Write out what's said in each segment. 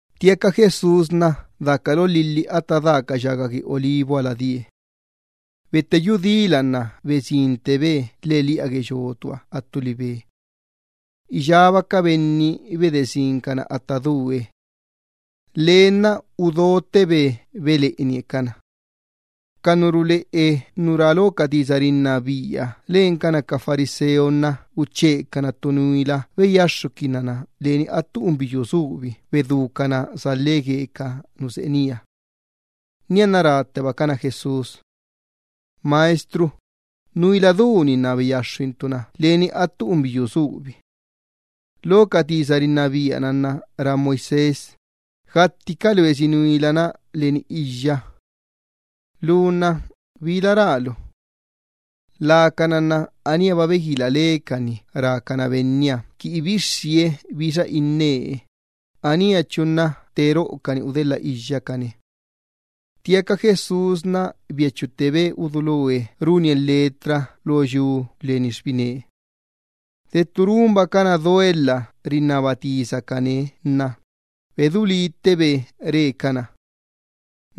Ttiaca Jesús daca lo lhilhi lána Atta Da ca ya gue Olivuhaba die. Betteyú dila nna besinttebe lheꞌeliꞌa gue yotuha attu libe. Iyába ca benni bedesincana atta due. Lee nna udottebe beleꞌenie cana. Ca nu ruleꞌe nu rá lo ca ley bocaꞌana Moisés lencana ca fariseo, uchecana ttu nuila beyaxxuquinna leni ttu unbiyuu bittu anca latselani bedúcan-na salhe gue ca nu seꞌe nía. Nianna ráttebacana Jesús: —Maestro, nuila du-ni nna beyaxxuintu na leni attu unbiyuu subi. Lo ca ley-na rá Moisés, gattiba ca loesi nuila-na leni iyya. Lu nna ¿bila rálu? Lacana nna aníaba beguila lecani rácana Benniha qui ibixxie bixa innee, aníachu nna te roꞌocani udelha iyyacane. Ttiaca Jesús biachuttebe uduloe runie letra lo yu leni xbine. De ttu runbacana duelha rinnaba tisacane nna bedú líttebe re cana: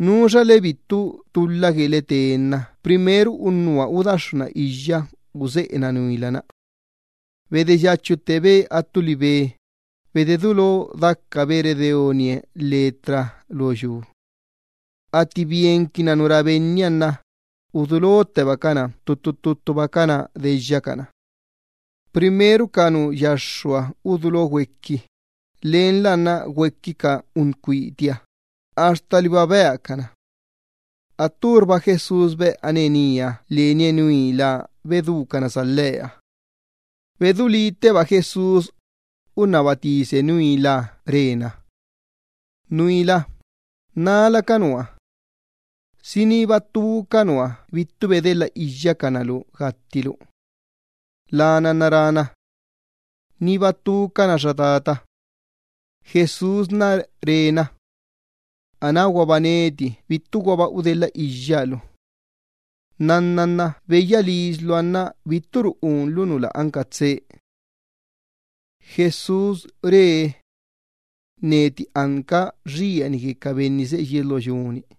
—Nuxale bittu tulha guele te nna primero unnuha udaxxuna iyya useꞌena nuila-na. Bedeyachuttebe attu libe, bededulo dacabe redeonie letra lo yu. Atti bienquinna nu rá Benniha nna udulottebacana ttuttu ttuttubacana deyyacana. Primero ca nu yaxxuha udulo güequi, lenla nna güequi ca uncuitiha, axta liba beacana. Atturba Jesús beꞌane nía lenie nuila bedúcana salheha. Bededulítteba Jesús, unnaba tise nuilaha re na: —Xa nuila, ¿nala ca nua? ¿Si niba ttu ca nua bittu bedelha iyyacana lu gattilu? Lana nna rána: —Niba ttucana, xa tata. Jesús re na: —Anáguaba neti bittuguaba udelhiyya lu. Nnanna nna beyya lisluha nna bitturu eyequilu unlu nu lä anca tsee.] Jesús re: “Neti anca xieni gue ca benni seꞌe yies lo yu-ni”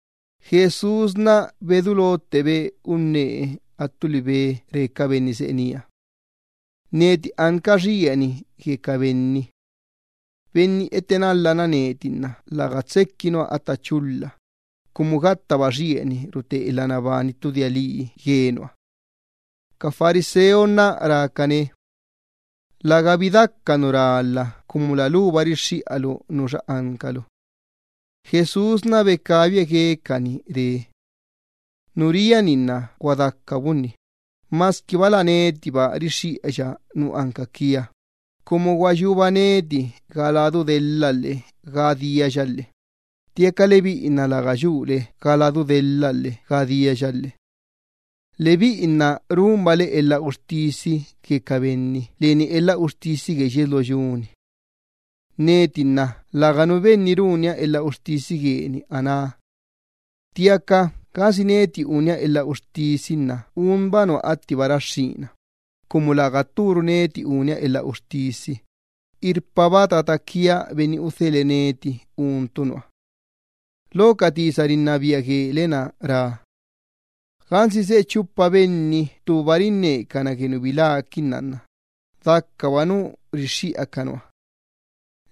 Jesús bedulottebe unnee attu libe re ca benni seꞌe nía: —Neti anca xieni gue ca benni seꞌe yies lo yu. Benni etenalhana neti nna läga tsequi nua atta chulha, cumu gattaba xieni rute elha nabani ttu dia lii gue nua. Ca fariseo nna rácane: —Lägabi daca nu rálha cumu la luba rixxiꞌalu nuxa ancalu. Jesús becabie guecani re: —Nu ria-ni nna gua daca bunni, masquiba la netiba rixxiꞌaya nu anca quia, cumu gua yuba ga biríaya daya lhe ga ladu diaya lhe ttiaca lebiꞌi nna läga yule ga biríaya lhe ga ladu diaya lhe. Lebiꞌi nna runbale elha uxtisi gue ca benni leni elha uxtisi gue yies lo yu-ni. Neti nna läganu benni runia elha uxtisi gueni aná. Ttiaca gansi neti unia elha uxtisi nna unba nua attiba raxxína, cumu läga tturu neti unia elha uxtisi, irpaba tata quia Benni udhelhe neti untu nua. Lo ca ley guele-na rá: Gansi seꞌe chupa benni ttuba rinnecana gue nu biláquinna dacaba nu rixxiꞌa ca nua.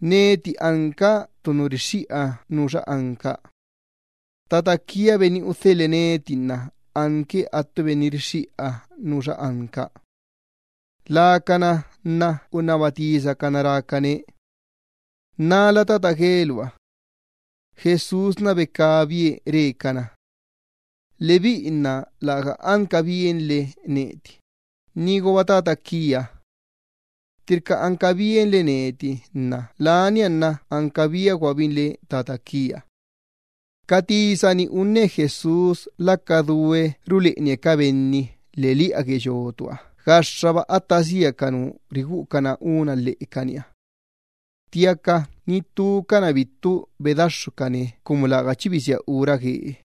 Neti anca ttu nu rixxiꞌa nuxa anca. Tata quia Benni udhelhe neti nna anque attu benni rixxiꞌa nuxa anca. Lacana nna unnaba tisacana rácane: —¿Nala tata gueluha? Jesús becabie re cana: —Lebiꞌi nna läga anca bienle neti, niguaba tata quia. Ttirca anca bienle neti nna lania nna anca biaguabinle Tata quia. Ca tisa-ni unne Jesús laca due ruleꞌenie ca benni lheꞌeliꞌa gue yotuha gaxxaba atta sia ca nu riguꞌucana úna lheꞌecaniha. Ttiaca ni ttucana bittu bedaxxucane cumu läga chi bisía ura guee.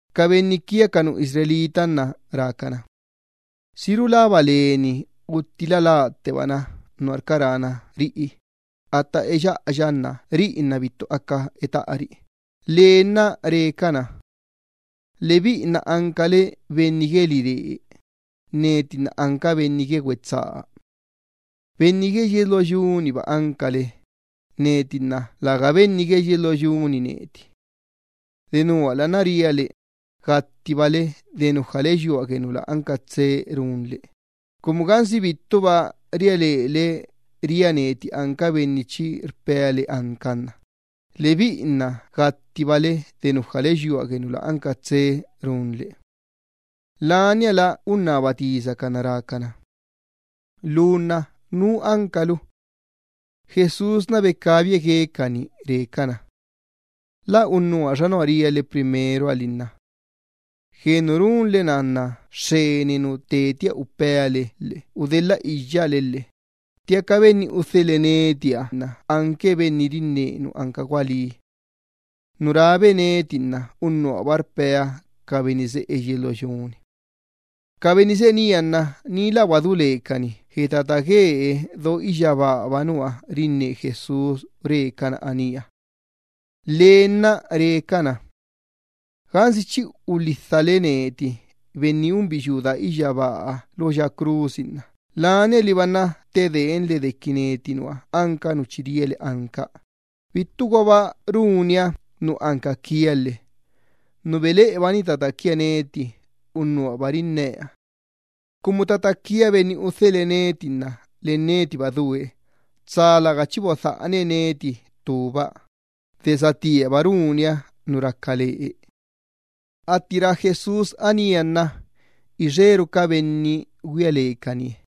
Ca benni quia ca nu Israel nna rácana: —¿Si rulaba leni la lattebana unna qui gattina nuarca rána riꞌi atta eyyana nna riꞌi nna bittu aca etaꞌari? Lee nna re cana: —Lebiꞌi nna ancale benni gue liree, neti nna anca benni gue güetsaa. Benni gue yies lo yu-niba ancale, neti nna läga benni gue yies lo yu-ni neti. Denuala nna ria le, gattibale de runle nu lä anca tsee, cumu gansi bittuba ria lele ria neti anca benni chi rpea le anca nna lebiꞌi nna gattibale de runle nu lä anca tsee. Laniala unnaba tisacana rácana: —Lu nna ¿nú ancalu? Jesús becabie guecani re cana: —La unnuha xa nua ria le primeroha li nna. Gue nu runle-na xxeni nu tetia upea le lhe udelhiyya le lhe ttiaca Benni udhelhe netiha anque Benni rinne nu anca gualí. Nu rábe neti nna unnuhaba rpea ca benni seꞌe yies lo yu-ni. Ca benni seꞌe nía nna ni lä guadú lecani gue Tata guee do iyyabaahaba nua rinne Jesús re cana anía. Lee nna re cana: —Gansi chi ulhidhale neti Benni unbiyuu daa iyyabaaha lo crusi nna lania liba ttedeenle neti nua anca nu chi ria le anca, bittuguaba runia nu anca quia lhe. Nu beleꞌebani tata quia neti, unnuhaba rinnea. Cumu tata quia Benni udhelhe neti nna len netiba due, tsa läga chi bodhaꞌane neti ttuba, de satíaba runia nu raca lee. Atti rá Jesús anía nna ixeru ca benni güia lecanie.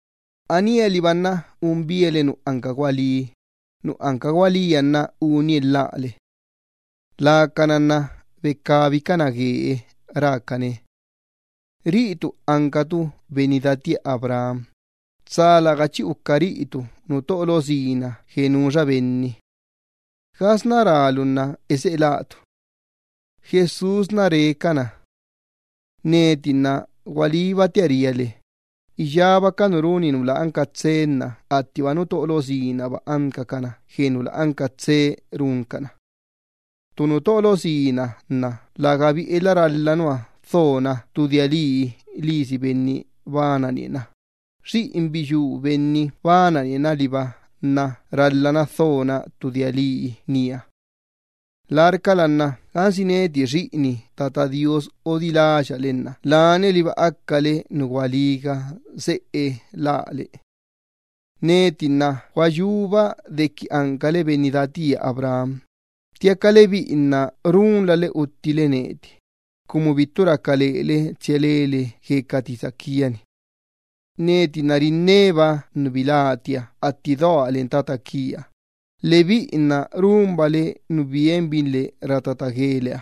Anía liba nna un biale nu anca gualí, nu anca gualíha nna unie lhále. Lacana nna becabicana guee rácane: —Riꞌitu ancatu benni datía Abraham, tsa läga chi uca riꞌitu nu ttoꞌo lo sina gue nuxa benni. ¿Gasná rálu nna eseꞌe látu? Jesús re cana: —Neti nna gualíbatia ria le, iyába ca nu runi nu lä anca tsee nna attiba nu ttoꞌo lo sinaba ancacana gue nu lä anca tsee runcana. Ttu nu ttoꞌo lo sina nna lägabi elha ralha nua dhona ttu dia lii lisi Benni bananie na, xiꞌin biyuu Benni bananie na liba nna ralhana dhona ttu dia lii nía. Larcala nna gansi neti xiꞌini Tata Do Iyyabaaha odiláya le nna lania liba acale nu gualíga seꞌe lále. Neti nna gua yuba dequi ancale benni datía Abraham, ttiaca lebiꞌi nna runlale uttile neti, cumu bittu raca lele tsia lele gue ca tisa quia-ni. Neti nna rinneba nu bilátia atti doa len Tata quia, lebiꞌi nna runbale nu bienbinle rá tata gueleha.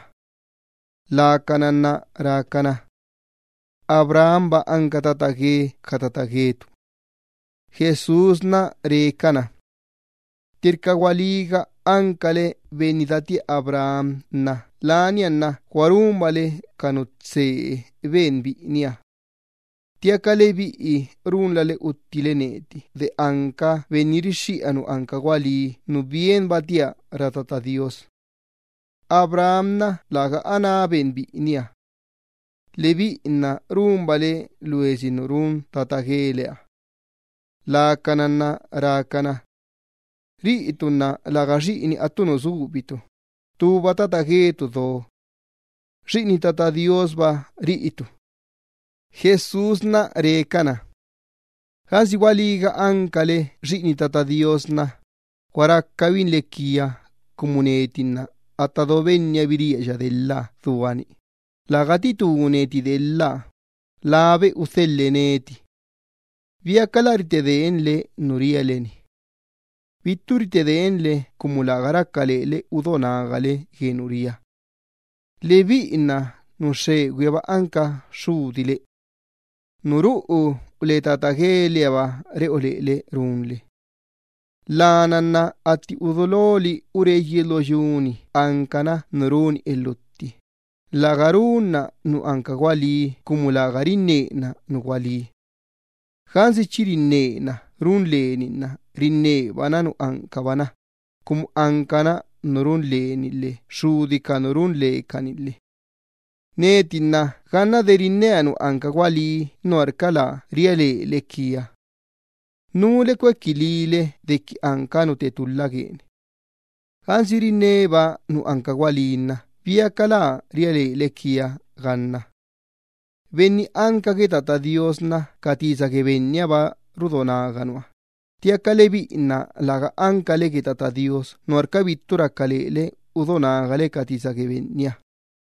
Lacana nna rácana: —Abrahamba anca benniola gue ca tata guetu. Jesús re cana: —Ttirca gualíga ancale benni datía Abraham, lania nna gua runbale ca nu tsee ben biꞌiniha. Ttiaca lebiꞌi runlale uttile neti de anca benni rixxiꞌa nu anca gualí, nu bienbatia rá Tata Do Iyyabaaha. ¡Abraham tsa läga ben biꞌiniha atti runle na! Lebiꞌi nna runbale loesi nu run tata gueleha. Lacana nna rácana: —Riꞌitu nna läga ancatu xiꞌini attu nu subi, ttuba tata guetu do. Xiꞌini Tata Do Iyyabaahaba riꞌitu. Jesús re cana: —Gansi gualíga ancale xiꞌini Tata Do Iyyabaaha nna gua racabinle quia cumu neti nna atta do Benniha biríaya delha dua-ni, läga titú neti delha, labe udhelhe neti. ¿Biacala bittu ritedeenle gue nu rpeale-ni? Lebiꞌi nna bittu ritedeenle cumu läga raca lele udo nagale gue nu ria. Lebiꞌi nna nu xxegüihaba anca xxudile. Nu ruꞌu le tata guelehaba reꞌo lele runle. Lana nna atti uduloli ure yies lo yu-ni ancana nu runi elhutti, läga runna nu anca gualí cumu läga rinnena nu gualí. Gansi chi rinnena run leni nna rinnebana nu ancabana, cumu ancana nu run leni lhe xxudi ca nu run lecani lhe. Neti nna ganna de rinnea nu anca gualí nuarca bittu ria lele quia. ¿Núle cuequilíle dequi anca nu te tulha gueni? Gansi rinneba nu anca gualí nna ¿biacala bittu ria lele quia ganna? Benni anca gue Tata Do Iyyabaaha nna ca tisa gue Bennihaba rudo naga nua, ttiaca lebiꞌi nna läga ancale gue Tata Do Iyyabaaha, nuarca bittu raca lele udo nagale ca tisa gue Benniha.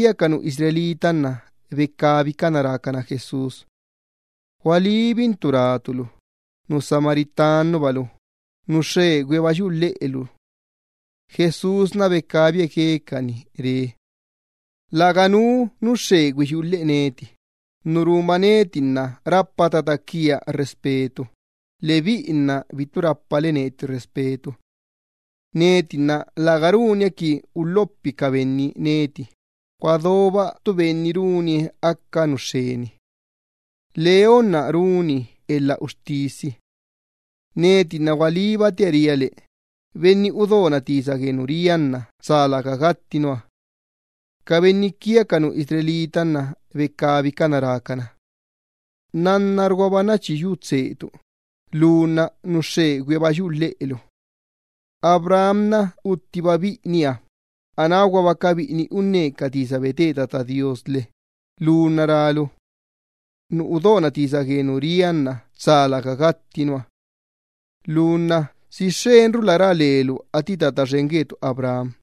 Ca nu Israel nna becabicana rácana Jesús: —Gualíbintu rátu lu, nu Samariaba lu, nu xxegüihaba yuꞌu lheꞌelu. Jesús becabie guecani re: —Läganu nu xxegüi yuꞌu lheꞌe neti, nu runba nna rapa tata quia respeto, lebiꞌi nna bittu rapale neti respeto. Neti nna läga runia qui cuequi xen ca benni neti, gua doba ttu benni runie aca nu ra xxeni leni. Leonna runi elha uxtisi. Neti nna gualíbatia ria le, benni udona tisa gue nu ria nna tsa läga gatti nua. Ca nu Israel nna becabicana rácana: —Nannarguaba nna chi yu tseetu, lu nna nu xxegüihaba yuꞌu lheꞌelu. Abraham uttiba biꞌiniha, anáguaba ca biꞌini uca profeta lhe lu nna rálu: “Nu udona tisa gue nu ria nna tsa läga gatti nua.” Lu nna ¿si xxenrula rá lelu atti benniola guetu Abraham?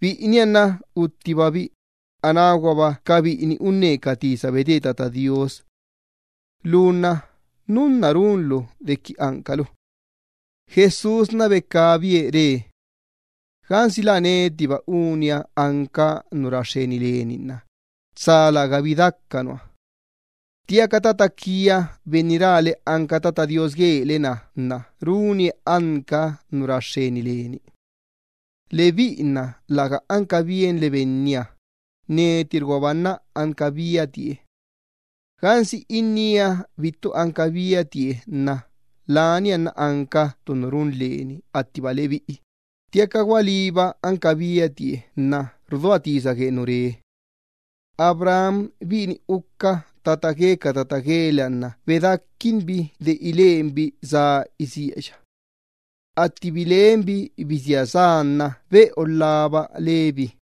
Biꞌiniha nna uttibabi, anáguaba ca biꞌini uca profeta. Lu nna ¿núnna runlu dequi ancalu? Jesús becabie re: —Gansi la netiba unia anca nu ra xxeni leni nna tsa lägabi daca nua. Ttiaca tata quia benni rále anca Tata Do Iyyabaaha guele-na runie anca nu ra xxeni leni. Lebiꞌi nna läga anca bienle Benniha, netirguaba nna anca biatie. Gansi innía bittu anca biatie nna lania nna anca ttu nu run leni attiba lebiꞌi, ttiaca gualíba anca biatie lhe rudoa tisa gue nu re lhe. Abraham biꞌini uca tata gue ca tata gueleha nna bedáquinbi de ilenbi sá isíaya. Atti bilenbi bisía sá nna beꞌolhaba lebi.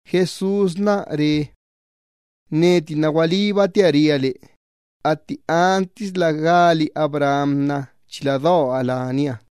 Jesús re cana: —Neti nna gualíbatia ria le, atti antisla gali Abraham, chila doa lania.